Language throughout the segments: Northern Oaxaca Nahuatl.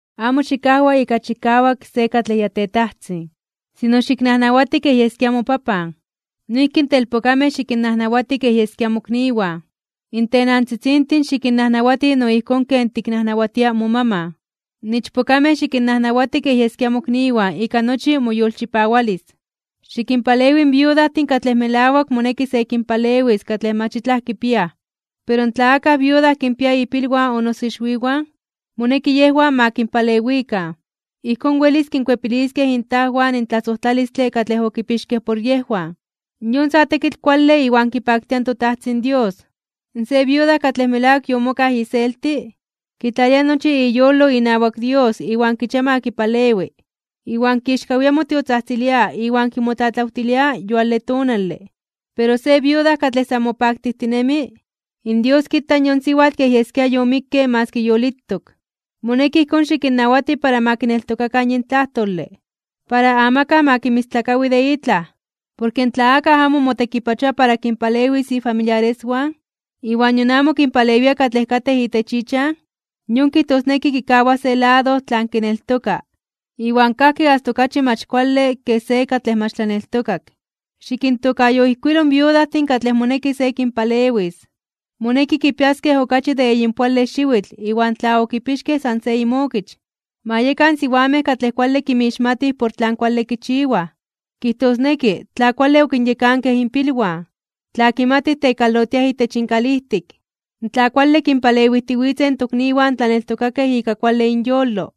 Amo xikajwa ika chikawak se katlej ya tetajtzin. Sino xiknajnawati kej yeskia mopapan. Noijki in telpokamej xikinnajnawati kej yeskia mokniwan. In tenantzitzintin xikinnajnawati no ijkón ken tiknajnawatia momaman. In ichpokamej xikinnajnawati kej yeskia mokniwan ika nochi moyolchipawalis. Xikinpalewi in viudajtin katlej melawak moneki se kinpalewis katlej mach itlaj kipiaj. Pero tla akaj viuda kinpia ipilwan o noso ixwiwan, moneki yejwan ma kinpalewikan. Ijkón welis kinkuepiliskej intajwan in tlasojtlalistle katlej okipixkej por yejwan. Yon sa tekitl kuale iwan kipaktia in toTajtzin Dios. Se viuda katlej melawak yomokaj iselti, kitlalia nochi iyolo inawak Dios iwan kichia ma kipalewi, iwan kixkawia (momelia) motiotzajtzilia iwan kimotlatlawtilia yuale tonale. Pero se viuda katlej san mopaktijtinemi, in Dios kita yon siwatl kej yeskia yomikke maski yolitok. Moneki ijkón xikinnawati para ma kineltokakan yin tlajtole. Para amakaj ma kinmistlakawi de itlaj. Porke tla akaj amo motekipachoa para kinpalewis ifamiliareswan, iwan nion amo kinpalewia katlej katej itech ichan, yon kijtosneki kikawa se lado tlan kineltoka, iwan kajki asta okachi mach kuale ke se katlej mach tlaneltokak. Xikintokayoijkuilo in viudajtin katlej moneki se kinpalewis. Moneki kipiaskej okachi de eyinpoale xiwitl iwan tla okipixkej san se inmokich. Ma yekan siwamej katlej kuale kinmixmatij por tlan kuale kichiwaj. Kijtosneki, tla kuale okinyekankej inpilwan, tla kimatij tekalotiaj itech inkalijtik, tla kuale kinpalewijtiwitzej in tokniwan tlaneltokakej ika kuale inyolo,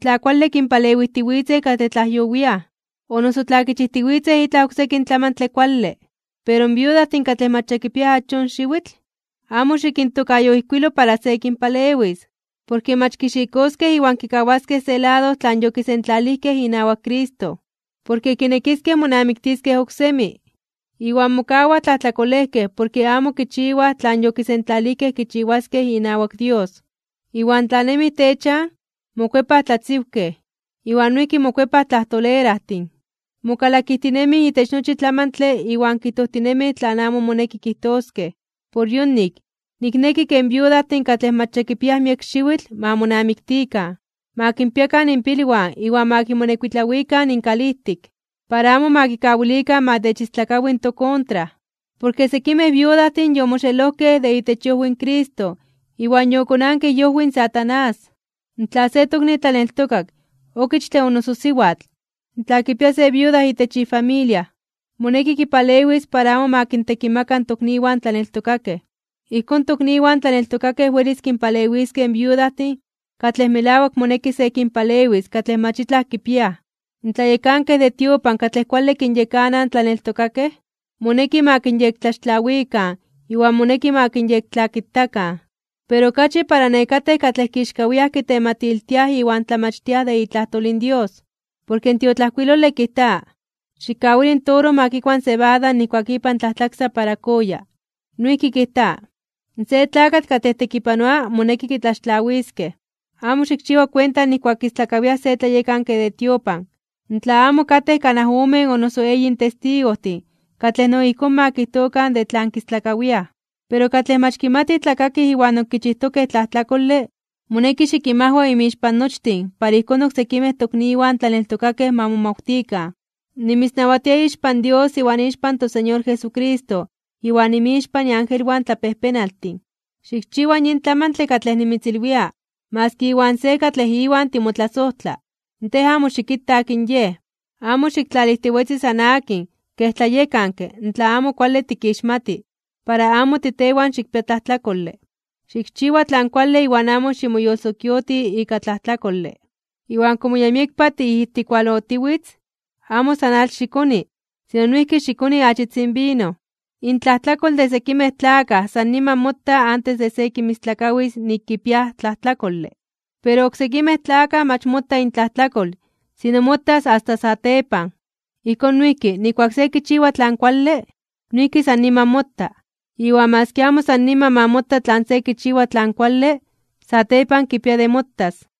tla kuale kinpalewijtiwitzej katlej tlajyowiaj, o noso tla kichijtiwitzej itlaj oksekin tlamantle kuale. Pero in viudajtin katlej mach ya kipiaj achón xiwitl, amo xikintokayoijkuilo para se kinpalewis. Porke mach kixikoskej iwan kikawaskej se lado tlan okisentlalijkej inawak Cristo, porke kinekiskej monamiktiskej oksemi. Iwan mokawaj tlajtlakolejkej porke amo kichiwaj tlan yokisentlalijkej kichiwaskej inawak Dios. Iwan tla nemij techan, mokuepaj tlatziwkej, iwan noijki mokuepaj tlajtolerajtin, mokalakijtinemij itech nochi tlamantle iwan kijtojtinemij tlan amo moneki kijtoskej. Por yonik, nikneki ke in viudajtin katlej mach ya kipiaj miek xiwitl ma monamiktikan, ma kinpiakan inpilwan iwan ma kimonekuitlawikan inkalijtik, para amo ma kikawilikan ma techistlakawi in tokontra. Porke sekimej viudajtin yomoxelojkej de itech iojwi in Cristo iwan yokonankej iojwi in Satanás. Tla se tokni tlaneltokak, okichtle o noso siwatl, tla kipia se viuda itech ifamilia, moneki kipalewis para amo ma kintekimaka in tokniwan tlaneltokakej. Ijkón, in tokniwan tlaneltokakej welis kinpalewiskej in viudajtin katlej melawak moneki se kinpalewis katlej mach itlaj kipiaj. In tlayekankej de tiopan katlej kuale kinyekanaj in tlaneltokakej, moneki ma kinyektlaxtlawikan iwan moneki ma kinyektlakitakan, pero okachi para nekatej katlej kixkawiaj (momeliaj) kitematiltiaj iwan tlamachtiaj de itlajtol in Dios. Porke in tiotlajkuilole kijta: “Xikkawili in toro ma kikua in sebada nijkuak ipan tlajtlaksa para kooya.” Noijki kijta: “Se tlakatl katlej tekipanoa moneki kitlaxtlawiskej.” Amo xikchiwa kuenta nijkuak kistlakawiaj se tlayekanke de tiopan, tla amo katej kanaj omen o noso eyin testigojtin katlej no ijkón ma kijtokan de tlan kistlakawiaj. Pero katlej mach kimatij tlakakij iwan ok kichijtokej tlajtlakole, moneki xikinmajwa inmixpan nochtin para ijkón oksekimej tokniwan tlaneltokakej ma momawtikan. Nimitznawatia ixpan Dios iwan ixpan toSeñor Jesucristo iwan inmixpan iangelwan tlapejpenaltin, xikchiwa yin tlamantle katlej nimitzilwia maski iwan se katlej iwan timotlasojtla. Tej amo xikita akin yej. Amo xiktlalijtiwetzi san akin kej tlayekanke tla amo kuale tikixmati, para amo titewan xikpia tlajtlakole. Xikchiwa tlan kuale iwan amo ximoyolsokioti ika tlajtlakole. Iwan komo ya miekpa tiijtikualotiwitz, amo san atl xikoni, sino noijki xikoni achitzin vino. Intlajtlakol de sekimej tlakaj san niman mota antes de se kinmistlakawis nik kipiaj tlajtlakole. Pero in oksekimej tlakaj mach mota intlajtlakol, sino motas asta satepan. Ijkón noijki, nijkuak se kichiwa tlan kuale, noijki san niman mota. Iwan maski amo san niman ma mota tlan se kichiwa tlan kuale, satepan kipia de motas.